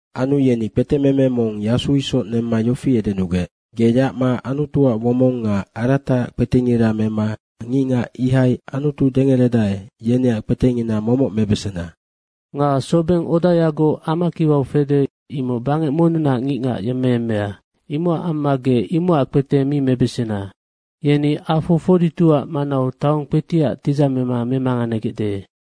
Anu yeni kpetememe mong yasu isoc nemma yofi edenugec, “Ge yacma Anutuac womong nga arataac kpetengira mema ngicngac ihai Anutu dengeredae, yeneac kpetengina momoc mebesena. Nga sobeng odayagoc amakiwau fede, imoc bangec monnunac ngicngac yemmeyemmea. Imocac amma ge imocac kpete mi mebesena. Yeni afo 42ac manau taong kpetiac tidzamema memanganegecde.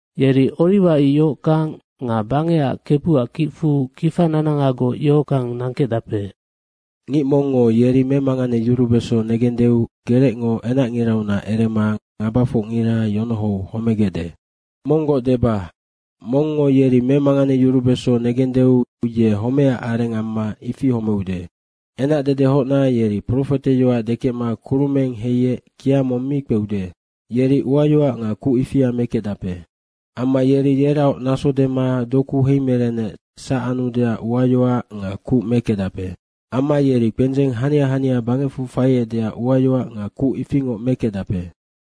Yeri oriwa ic yohockang nga bangecac Kebuac kicfu kifa nanangagoc yohockang nangkecdape. Ngic mongngo yeri memanganeyurubeso negendeu gerecngo enacngiraunac erema ngabafocngira yonohou homegecde. Monggoc deba, mongngo yeri memanganeyurubeso negendeu ye homecac areng amma ifi homeude. Enacdedehocna yeri profeteyoac dekecma kurumeng heiec kia mong mi kpeude, yeri uayoac nga kuc ifia mekecdape. Amma yeri yeraoc naso dema doku heimerenec sac anudeac uayoac nga kuc mekecdape. Amma yeri kpendzeng hania hania bangecfu faiecdeac uayoac nga kuc ifingoc mekecdape.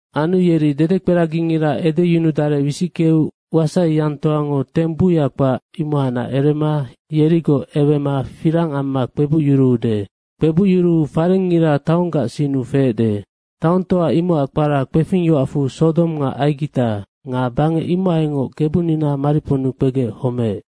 Anu yeri dedekperagingira edeyunudarec wisickeu wasaiyangtoango teng buya kpac, imohacnac erema yerigoc ewema firang amma kpebucyuruude. Kpebucyuruu farengngira taonggac sinnu feecde. Taongtoa imocac kpara kpefing yoacfu Sodong nga Aigita nga bangec imohaingoc Kebunina mariponnu kpegec homeec.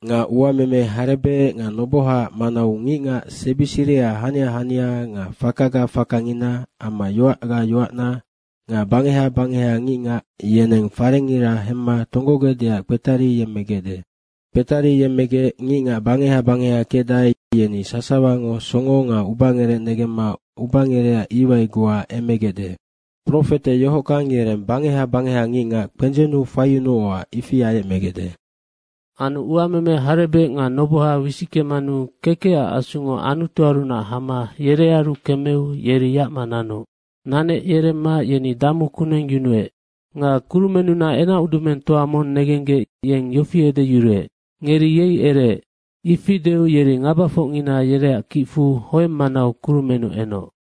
Nga uameme harebec nga nobohaac manau ngicngac sebi siriha hania hania nga fakaga fakangina amma yoacga yoacna nga bangeha bangeha ngicngac yeneng farengngira hemma tonggogecdeac kpetariyemmegecde. Kpetariyemmegec ngicngac bangeha bangeha kecdae, yeni sasawango songo nga ubangerec negemma ubangerecac iwai goa emegecde. Profete yohockang yereng bangeha bangeha ngicngac kpendzennu faiyunuocac ifi ayecmegecde. Anu uameme harebec nga noboha wisickemanu kekecac asungo Anutuarunac hama yerearu kemeu yeri yacma nanoc. Nanec yeremma yeni damu kuneng yunuec. Nga kurumennunac enacudumengtoa mong negenggec yofi edeyuruec, “Ngeri yei ereec!” ifi deu yeri ngabafocngina yeneac kicfu hoeng manau kurumennu enoc.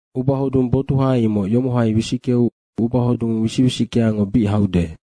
Ubahodung botuha imoc yomohai wisickeu ubahodung wisic wisickeango bic haude.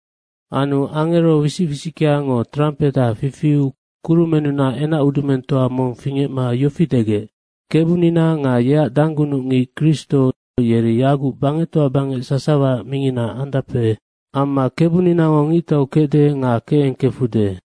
Anu angero wisic wisickeango trampeha fifiu kurumennunac enacudumengtoa mong fingecma yofi degec, “Kebunina nga yeac danggunucngic Kristo yeri yaguc bangectoa bangec sasawaac mingina andape. Amma Kebuninango ngictau kecde nga kecengkefude.”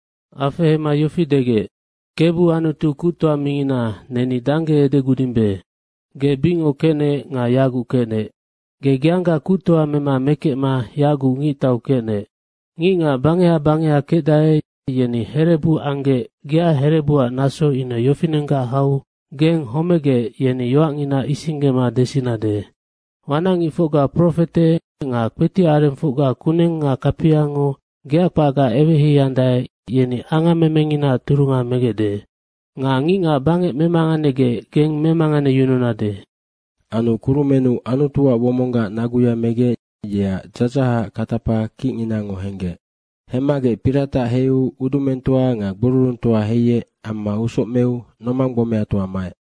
Afehema yofi degec, “Kebu Anutu Kuctoa mingina, neni dangge edegudimbe. Ge bicngoc kecnec nga yaguc kecnec, ge geangga kuctoa mema mekecma yaguc ngictau kecnec. Ngicngac bangeha bangeha kecdae, yeni herebu anggec geac herebuac naso ine yofinenggac hau geng homegec yeni yoacngina isinggema desinade. Wanacngicfocga profete nga kpetiac arengfocga kuneng nga kapiango geac kpacga eweheiandae, yeni angammemenginaac turunga megecde. Nga ngicngac bangec memanganegec geng memanganeyununade.” Anu kurumennu Anutuac womonggac naguya megec yeac dzadzahacac katapa kicnginango henggec. Hemmagec piratac heiu udumengtoa nga gbururungtoa heiec amma usoc meu nomang gbomeatoa maec.